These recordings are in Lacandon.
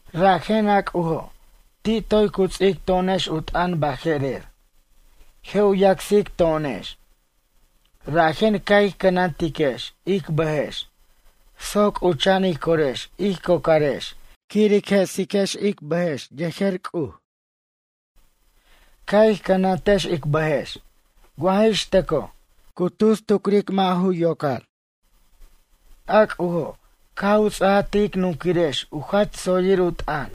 Rajen, a C'ujo', ti' toy cu ts'ic to'onex u t'ʌn baje'rer, “Je' u yacsic to'onex.” Rajen ca' ij cʌnantiquex ic bʌjex soc c'ucha'an ij corex ij cocarex quir ic je'sic ic bʌjex yejer C'uj. Ca' ij cʌnantex ic bʌjex wa jix tʌco cu tus tucric mʌ' ju yocar. A C'ujo' caj u ts'ajaj ti' ic nunquirex u jach tsoyir u t'ʌn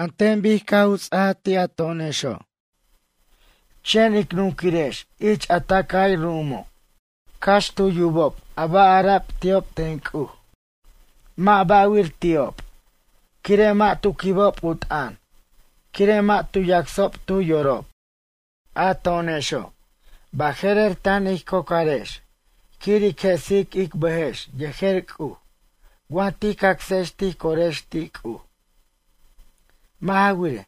an ten bic caj u ts'ajaj ti' a to'onexo'. Chen ic nunquirex ich a tʌcay ru'umo', cax tu yubob a ba' ara'b ti'ob ten C'uj mʌ' ba'wir ti'ob quire' mʌ' tu quibob u t'ʌn, quire' mʌ' tu yacsob tu yorob. A to'onexo', baje'rer tan ij cocarex quir ic je'sic ic bʌjex yejer C'uj wa tij cacsex tij corex ti' C'uj. Mʌ' ja wirej,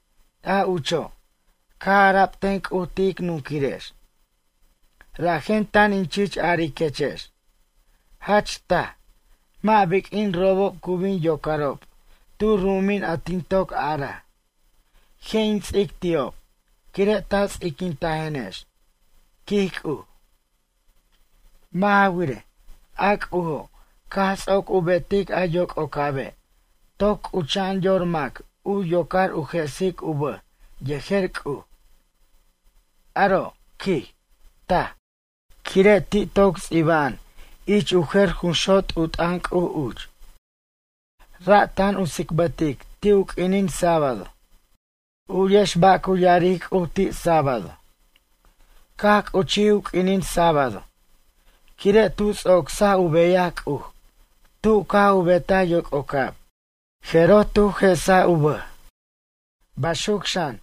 a ucho' caj ara'b ten C'uj ti' ic nunquirex: Rajen tan in chich ariquechex, “Jach taj, mʌ' biq'uin robob cu bin yocarob tu ru'umin a tin toc araj: Je' in ts'ic ti'ob, quire' ta ts'iquintajenex.” quij C'uj. Mʌ' ja wirej, a C'ujo' caj ts'oc u betic a yoc'ocabe' toc c'ucha'an yor mac u yocor u je'sic u bʌj yejer C'uj. Aro', quij, taj, quire' ti' toc ts'iba'an ich u jer junxot' u t'ʌn C'uj uch. Ra' tan u tsicbʌtic ti' u q'uinin sábado. U'yex ba' cu ya'aric C'uj ti' sábado: Caj c'uchij u q'uinin sábado quire' tu ts'ocsaj u beyaj C'uj tu caj u betaj yoc'ocab jeroj tu je'saj u bʌj. Baxuc xan,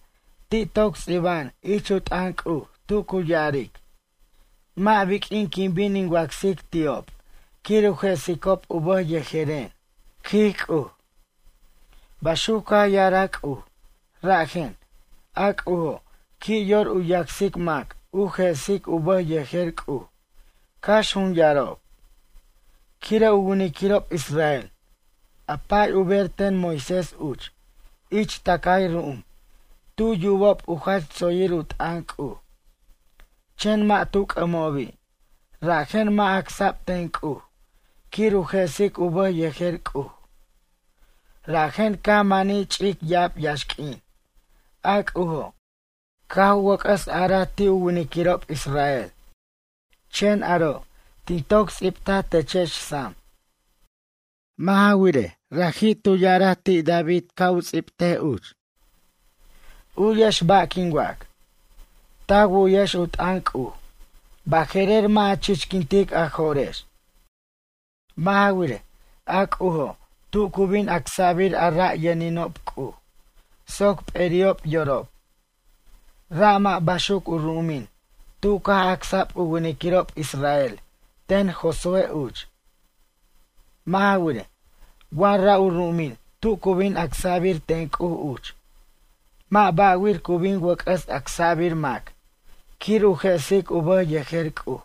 ti' toc ts'ba'an ich u t'ʌn C'uj tu cu ya'aric: Mʌ' biq'uin quin bin in wacsic ti'ob quir u je'sicob u bʌj yejeren, quij C'uj. Baxuc caj ya'araj C'uj rajen, a C'ujo' qui' yor u yacsic mac u je'sic u bʌj yejer C'uj cax jun yarob. Quire' u winiquirob israel, a pa'y u ber ten Moisés uch ich tʌcay ru'um tu yubob u jach tsoyir u t'ʌn C'uj, chen mʌ' tu c'ʌmobi' rajen mʌ' acsa'b ten C'uj quir u je'sic u bʌj yejer C'uj. Rajen caj manij ch'ic ya'ab yaxq'uin a C'ujo' caj u wʌc'ʌs a'araj ti' u winiquirob Israel. Chen aro' tin toc ts'ibtaj techex sam. Mʌ' ja wirej, raji' u ya'araj ti' David ca' u ts'ibtej uch: U'yex ba' quin wac. Ta wu'yex u t'ʌn C'uj, baje'rer mʌ' a chichquintic a jo'rex. Mʌ' ja wirej, a C'ujo' tu cu bin acsa'bir a ra' yʌninob C'uj soc p'eri'ob yorob. Ra' mʌ' baxuc u ru'umin tu caj acsa'b u winiquirob israel ten Josué uch. Mʌ' ja wirej, wa ra' u ru'umin tu cu bin acsa'bir ten C'uj uch mʌ' ba'wir cu bin wʌc'ʌs acsa'bir mac quir u je'sic u bʌj yejer C'uj.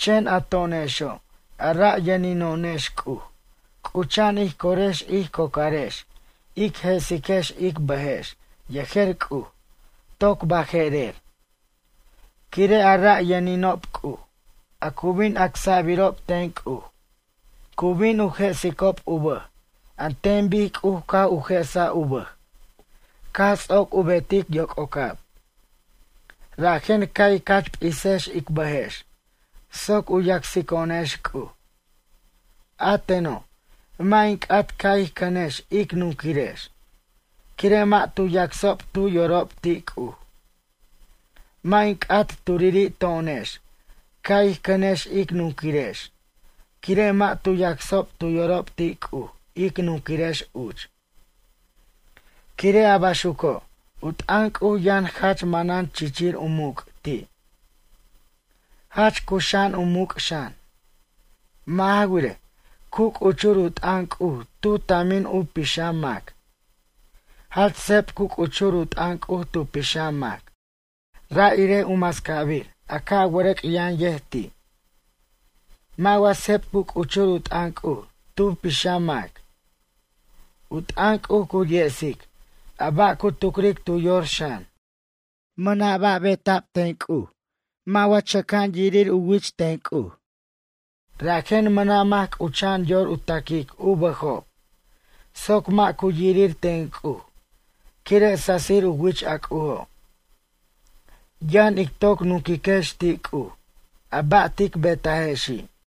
Chen, a to'onexo' a ra' yʌnino'onex C'uj c'ucha'an ij corex ij cocarex ic je'siquex ic bʌjex yejer C'uj toc baje'rer. Quire' a ra' yʌninob C'uj, a cu bin acsa'birob ten C'uj, cu bin u je'sicob u bʌj an ten bic C'uj caj u je'saj u bʌj caj ts'oc u betic yoc'ocab. Rajen ca' ic jach p'isex ic bʌjex soc u yacsico'onex C'uj. A teno', mʌ' in c'at ca' ij cʌnex ic nunquirex, quire' mʌ' tu yacsob tu yorob ti' C'uj. Mʌ' in c'at turiri' to'onex ca' ij cʌnex ic nunquirex quire' mʌ' tu yacsob tu yorob ti' C'uj ic nunquirex uch. Quire' a baxuco', u t'ʌn C'uj yʌn jach manan chichir u muc' ti'. Jach cuxa'an u muc' xan. Mʌ' ja wirej, cu c'uchur u t'ʌn C'uj tu tamin u pixam mac. Jach seb cu c'uchur u t'ʌn C'uj tu pixam mac. Ra' irej u mascabir a ca' wʌrʌc' yʌn yej ti'. Mʌ' wa seb cu c'uchur u t'ʌn C'uj tu pixam mac? U t'ʌn C'uj cu yesic a ba' cu tucric tu yor xan. Mʌna' ba' bet'ab ten C'uj mʌ' wa chʌca'an yirir u wich ten C'uj. Rajen mʌna' mac c'ucha'an yor u ta'quic u bʌjob soc mʌ' cu yirir ten C'uj quire' sasir u wich a C'ujo'. Yʌn ic toc nunquiquex ti' C'uj a ba' tic betajexi'.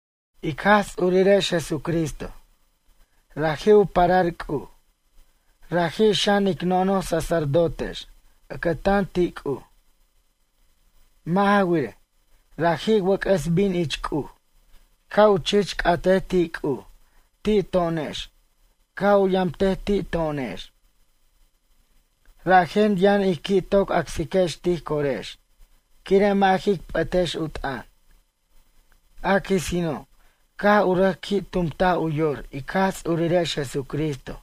Ic Jaj Ts'urirex Jesucristo, raji' u parar C'uj, raji' xan ic nono'j sacerdotex ʌcʌtan ti' C'uj. Mʌ' ja wirej, raji' wʌc'ʌs bin ich C'uj ca' u chich c'atej ti' C'uj ti' to'onex ca' u yamtej ti' to'onex. Rajen yʌn ij qui' toc acsiquex tij corex quire' mʌ' jic p'ʌtex u t'ʌn. A quisino', caj u rʌc qui' tumtaj u yor ic Jaj Ts'urirex Jesucristo,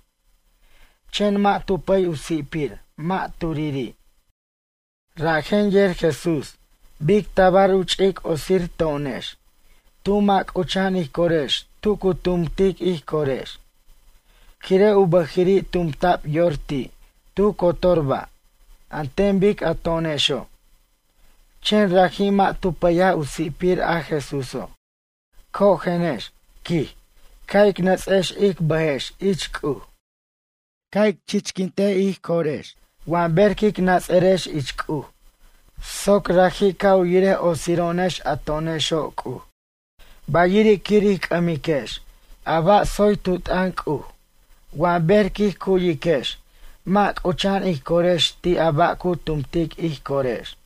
chen mʌ' tu pʌy u si'pir mʌ' turiri'. Rajen yer Jesús bic tabar u ch'ic otsir to'onex tu mʌ' c'ucha'an ij corex tu cu tumtic ij corex, quire' u bʌjiri' tumta'b yor ti' tu cotor ba' an ten bic a to'onexo', chen raji' mʌ' tu pʌyaj u si'pir a Jesúso'. Cojenex, quij, ca' ic nʌts'ex ic bʌjex ich C'uj. Ca' ic chichquint ij corex wa ber quic nats'ʌrex ich C'uj soc raji' ca' u yirej otsiro'onex a to'onexo' C'uj. Bayiri' quir ij c'ʌmiquex a ba' tsoy tu t'ʌn C'uj wa ber quij cu'yiquex mʌ' c'ucha'an ij corex ti' a ba' cu tumtic ij corex.